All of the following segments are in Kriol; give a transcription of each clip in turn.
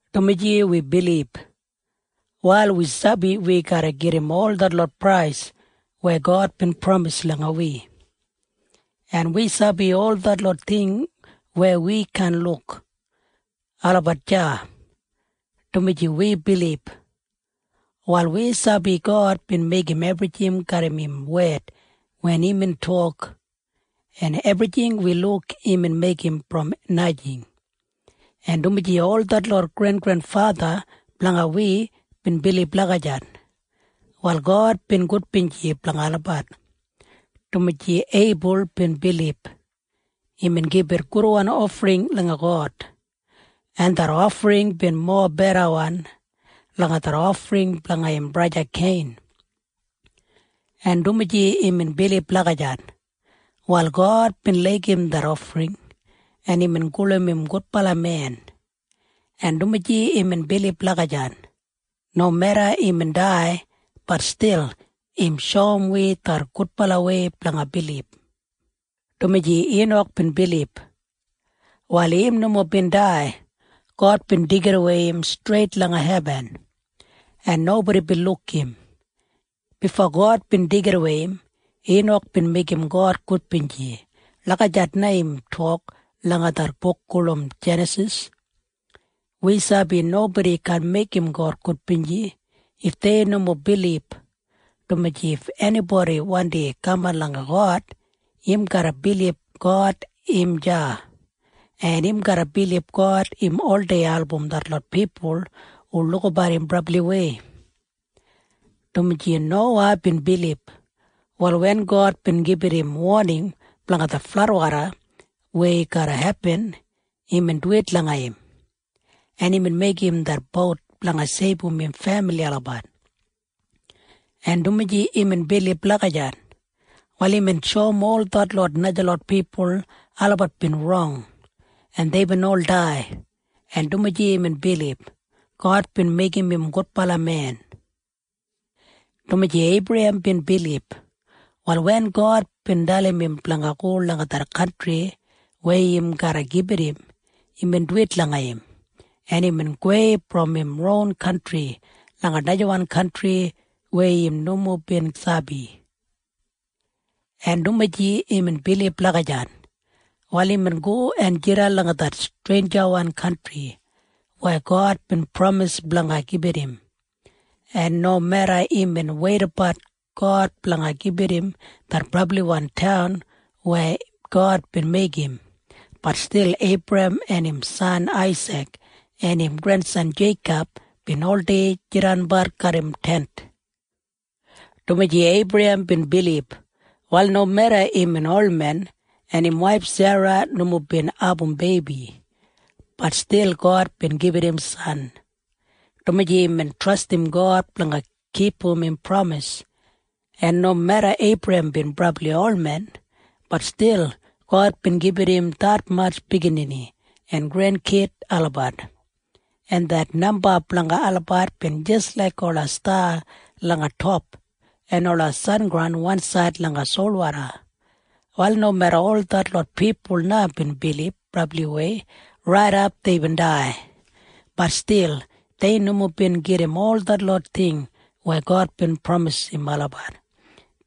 Dumaji wi bilib, wal wi sabi wi garra gedim ol detlot prais weya God bin pramis langa wi, en wi sabi ol detlot ting weya wi kaan luk, olabat deya. Dumaji wi bilib, wal wi sabi God bin meigim ebrijing garram im wed wen imbin tok, en ebrijing wi luk imbin meigim brom najing. En dumaji ol detlot grengrenfatha blanga wi bin bilib lagijat, wal God bin gudbinji blanga olabat. Dumaji Eibul bin bilib, imbin gibit gudwan ofring langa God, en det ofring bin mobedawan langa det ofring blanga im braja Kein. En dumaji imbin bilib lagijat, wal God bin laigim det ofring, en imbin gulum im gudbala men. En dumaji imbin bilib lagijat, nomeda imbin dai, bat stil im shoum wi det gudbalawei blanga bilib. Dumaji Inak bin bilib, wal im nomo bin dai. God bin deigidawei im streit langa hebin, en nobodi bin luk im. Bifo God bin deigidawei im, Inak bin meigim God gudbinji. Lagijat na im tok langa det buk gulum Jenasis. Wi sabi nobodi kaan meigim God gudbinji if dei nomo bilib, dumaji if enibodi wandi kaman langa God, im garra bilib God im deya, en im garra bilib God im oldei album detlot pipul hu lukabat im brabliwei. Dumaji Nowa bin bilib, wal wen God bin gibit im woning blanga det fladwoda weya garra hepin, imbin duwit langa im, en imbin meigim det bout blanga seibum im femili olabat. En dumaji imbin bilib lagijat, wal imbin shoum ol detlot najalot pipul olabat bin rong, en deibin ol dai. En dumaji imbin bilib, God bin meigim im gudbala men. Dumaji Eibrahem bin bilib, wal wen God bin dalim im blanga go langa det kantri weya im garra gibit im, imbin duwit langa im, en imbin gowei brom im ron kantri langa najawan kantri weya im nomo bin sabi. En dumaji imbin bilib lagijat, wal imbin go en jidan langa det streinjawan kantri weya God bin pramis blanga gibit im, en nomeda imbin weidabat God blanga gibit im det brabliwan taun weya God bin meigim, bat stil Eibrahem en im san Aisik en im grensan Jeikob bin oldei jidanbat garram tent. Dumaji Eibrahem bin bilib, wal nomeda imbin olmen en im waif Sera nomo bin abum beibi, bat stil God bin gibit im san, dumaji imbin trastim God blanga kipum im pramis. En nomeda Eibrahem bin brabli olmen, bat stil God bin gibit im detmatj biginini en grenkid olabat, en det namba blanga olabat bin jis laik ola sta langa top en ola sengraun wansaid langa solwoda. Wal nomeda ol detlot pipul na bin bilib brabliwei raidap deibin dai, bat stil dei nomo bin gedim ol detlot ting weya God bin pramisim olabat.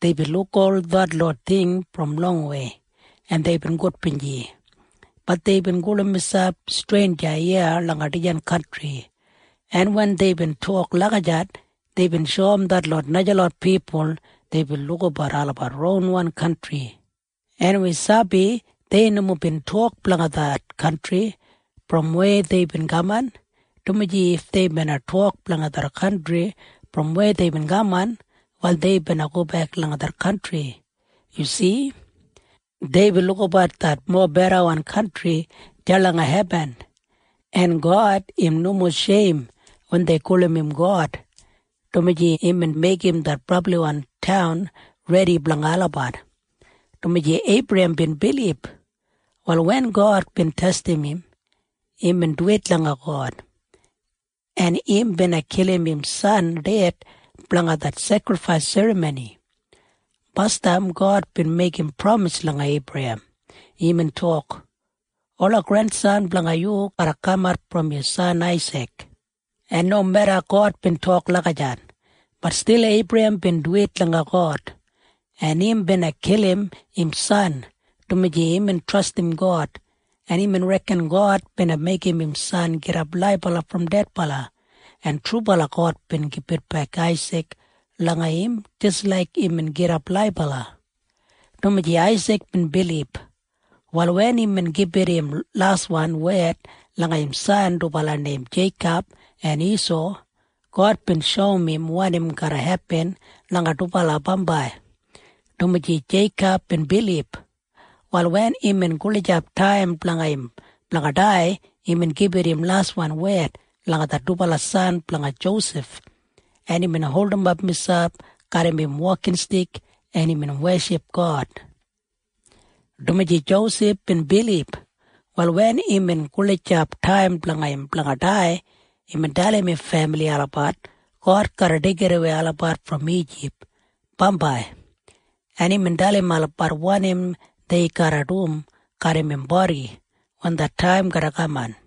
Deibin luk ol detlot ting brom longwei, en deibin gudbinji. Bat deibin gulum miselp streinja iya langa dijan kantri, en wen deibin tok lagijat, deibin shoum detlot najalot pipul deibin lukabat olabat ronwan kantri. En wi sabi dei nomo bin tok blanga det kantri brom weya deibin kaman, dumaji if dei bina tok blanga det kantri brom weya deibin kaman, wal dei bina gobek langa det kantri. Yu si? Deibin lukabat det mobedawan kantri deya langa hebin, en God im nomo sheim wen dei gulum im God, dumaji imbin meigim det brabliwan taun redi blanga olabat. Dumaji Eibrahem bin bilib, wal wen God bin testim im, imbin duwit langa God, en im bina kilim im san ded blanga det sekrifais serramoni. Basdam God bin meigim pramis langa Eibrahem. Imbin tok, “Ola grensan blanga yu garra kamat brom yu san Aisik.” En nomeda God bin tok lagijat, bat stil Eibrahem bin duwit langa God, en im bina kilim im san, dumaji imbin trastim God, en imbin reken God bina meigim im san gidap laibala brom dedbala, en trubala God bin gibitbek Aisik langa im jis laik imbin gidap laibala. Dumaji Aisik bin bilib, wal wen imbin gibit im laswan wed langa im san dubala neim Jeikob en Isau, God bin shoum im wanim garra hepin langa dubala bambai. Dumaji Jeikob bin bilib, wal wen imbin gulijap taim blanga im blanga dai, imbin gibit im laswan wed langa det dubala san blanga Josef, en imbin holdimap miselp garram im wokinstik, en imbin weship God. Dumaji Josef bin bilib, wal wen imbin gulijap taim blanga im blanga dai, imbin dalim im femili olabat God garra deigidawei olabat brom Ijip bambai, en imbin dalim olabat wanim dei garra dum garram im bodi wen det taim garra kaman.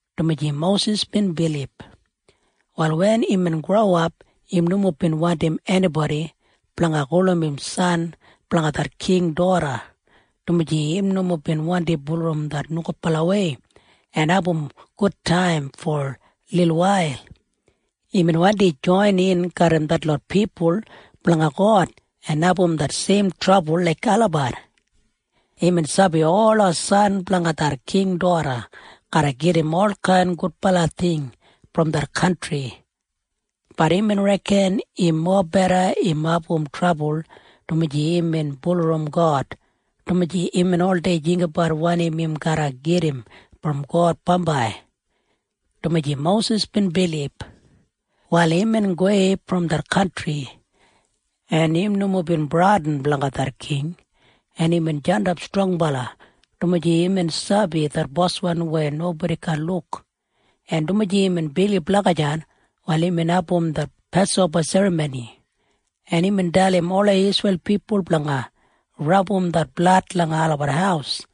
Dumaji Mosis bin bilib, wal wen imbin growap, im nomo bin wandim enibodi blanga gulum im san blanga det king doda, dumaji im nomo bin wandi bulurrum det nogudbalawei en abum gudtaim fo lilwail. Imbin wandi joinin garram detlot pipul blanga God en abum det seim trabul laik olabat. Imbin sabi ola san blanga det king doda garra gedim olkain gudbala ting brom det kantri. Bat imbin reken im mobeda im abum trabul dumaji imbin bulurrum God, dumaji imbin oldei jinggabat wanim im garra gedim brom God bambai. Dumaji Mosis bin bilib, wal imbin gowei brom det kantri, en im nomo bin bradin blanga det king, en imbin jandap strongbala, dumaji imbin sabi det Boswan weya nobodi kaan luk. En dumaji imbin bilib lagijat, wal imbin abum det Pasoba Serramoni, en imbin dalim ola Isreil pipul blanga rabum det blad langa olabat haus,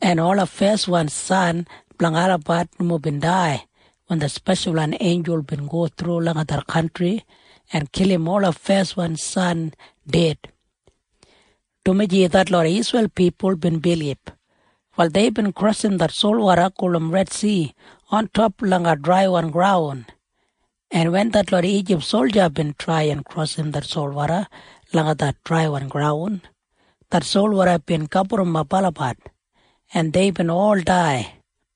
en ola feswan san blanga olabat nomo bin dai wen det speshalwan einjul bin go thru langa det kantri en kilim ola feswan san ded. Dumaji detlot Isreil pipul bin bilib, wal deibin krosim det solwoda gulum Redsi ontop langa draiwan graun, en wen detlot Ijip solja bin trai en krosim det solwoda langa det draiwan graun, det solwoda bin gaburrumap olabat, en deibin ol dai.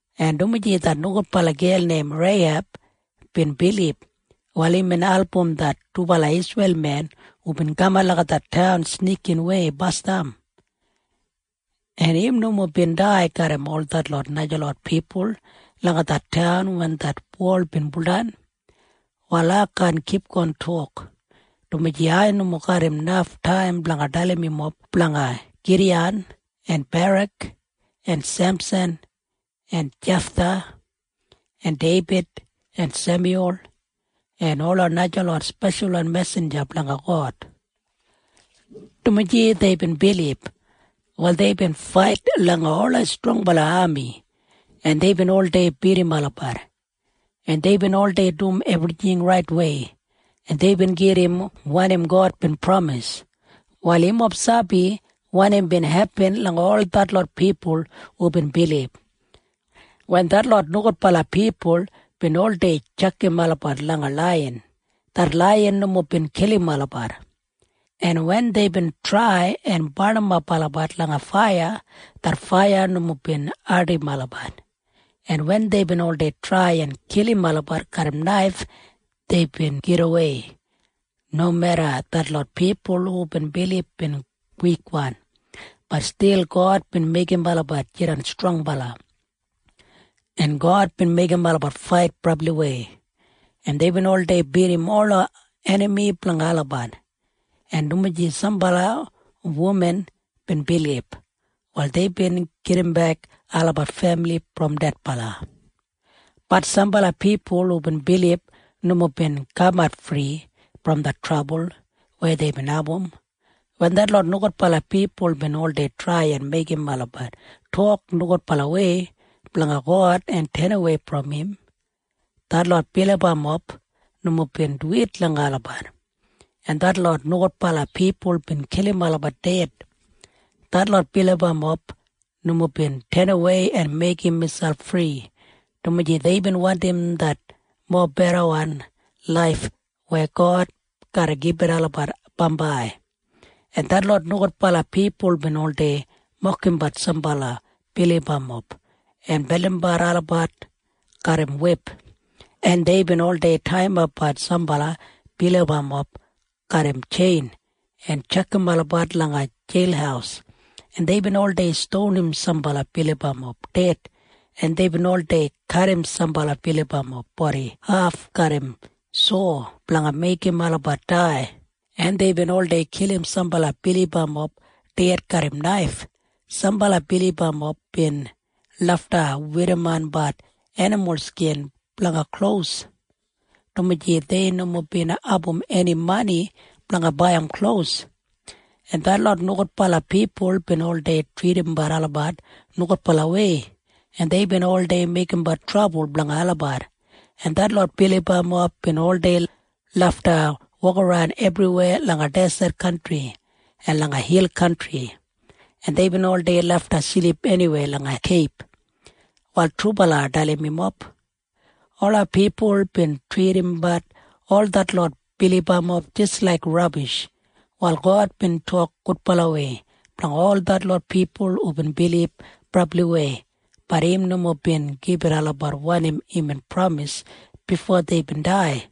En dumaji det nogudbala gel neim Reiheb bin bilib, wal imbin album det dubala Isreil men hubin kaman langa det taun snikinwei basdam, en im nomo bin dai garram ol detlot najalot pipul langa det taun wen det wol bin buldan. Wal ai kaan kipgon tok, dumaji ai nomo garram naf taim blanga dalim yumob blanga Gidiyan en Barak en Semsan en Jeftha en Deibid en Semyul en ola najalot speshalwan mesinja blanga God. Dumaji deibin bilib, wal deibin fait langa ola strongbala ami, en deibin oldei bidim olabat, en deibin oldei dum ebrijing raitwei, en deibin gedim wanim God bin pramis. Wal yumob sabi wanim bin hepin langa ol detlot pipul hubin bilib. Wen detlot nogudbala pipul bin oldei tjakam olabat langa laiyan, det laiyan nomo bin kilim olabat, en wen deibin trai en barnimap olabat langa faiya, det faiya nomo bin ardim olabat, en wen deibin oldei trai en kilim olabat garram naif, deibin gidawei. Nomeda detlot pipul hubin bilib bin wikwan, bat stil God bin meigim olabat jidan strongbala, en God bin meigim olabat fait brabliwei, en deibin oldei bidim ola enami blanga olabat. En dumaji sambala wuman bin bilib, wal deibin gedimbek olabat femili brom dedbala. Bat sambala pipul hubin bilib nomo bin kamat fri brom det trabul weya deibin abum. Wen detlot nogudbala pipul bin oldei trai en meigim olabat tok nogudbalawei blanga God en tenawei brom im, detlot bilibamob nomo bin duwit langa olabat, en detlot nogudbala pipul bin kilim olabat ded. Detlot bilibamob nomo bin tenawei en meigim miselp fri, dumaji deibin wandim det mobedawan laif weya God garra gibit olabat bambai. En detlot nogudbala pipul bin oldei mokimbat sambala bilibamob en beldimbat olabat garram wip. En deibin oldei taiyimapbat sambala bilibamob garram tjein en tjakam olabat langa jeil, en deibin oldei stonim sambala bilibamob ded, en deibin oldei kadim sambala bilibamob bodi haf garram sau blanga meigim olabat dai, en deibin oldei kilim sambala bilibamob ded garram naif. Sambala bilibamob bin lafta werrimonbat enimul skin blanga klos dumaji dei nomo bin abum eni mani blanga baiyim klos, en detlot nogudbala pipul bin oldei tridimbat olabat nogudbalawei. En deibin oldei meigimbat trabul blanga olabat, en detlot bilibamob bin oldei lafta wokaran ebriweya langa deset kantri en langa hil kantri, en deibin oldei lafta silip eniweya langa keib. Wal trubala ai dalim yumob. Ola pipul bin tridimbat ol detlot bilibamob jis laik rabish. Wal God bin tok gudbalawei blanga ol detlot pipul hubin bilib brabliwei. Bat im nomo bin gibit olabat wanim imbin pramis bifo deibin dai,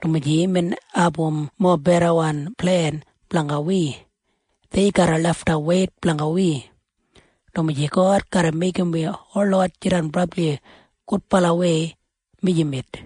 dumaji imbin abum mobedawan plen blanga wi. Dei garra lafta weit blanga wi, dumaji God garra meigim wi holot jidan brabli gudbalawei mijamet.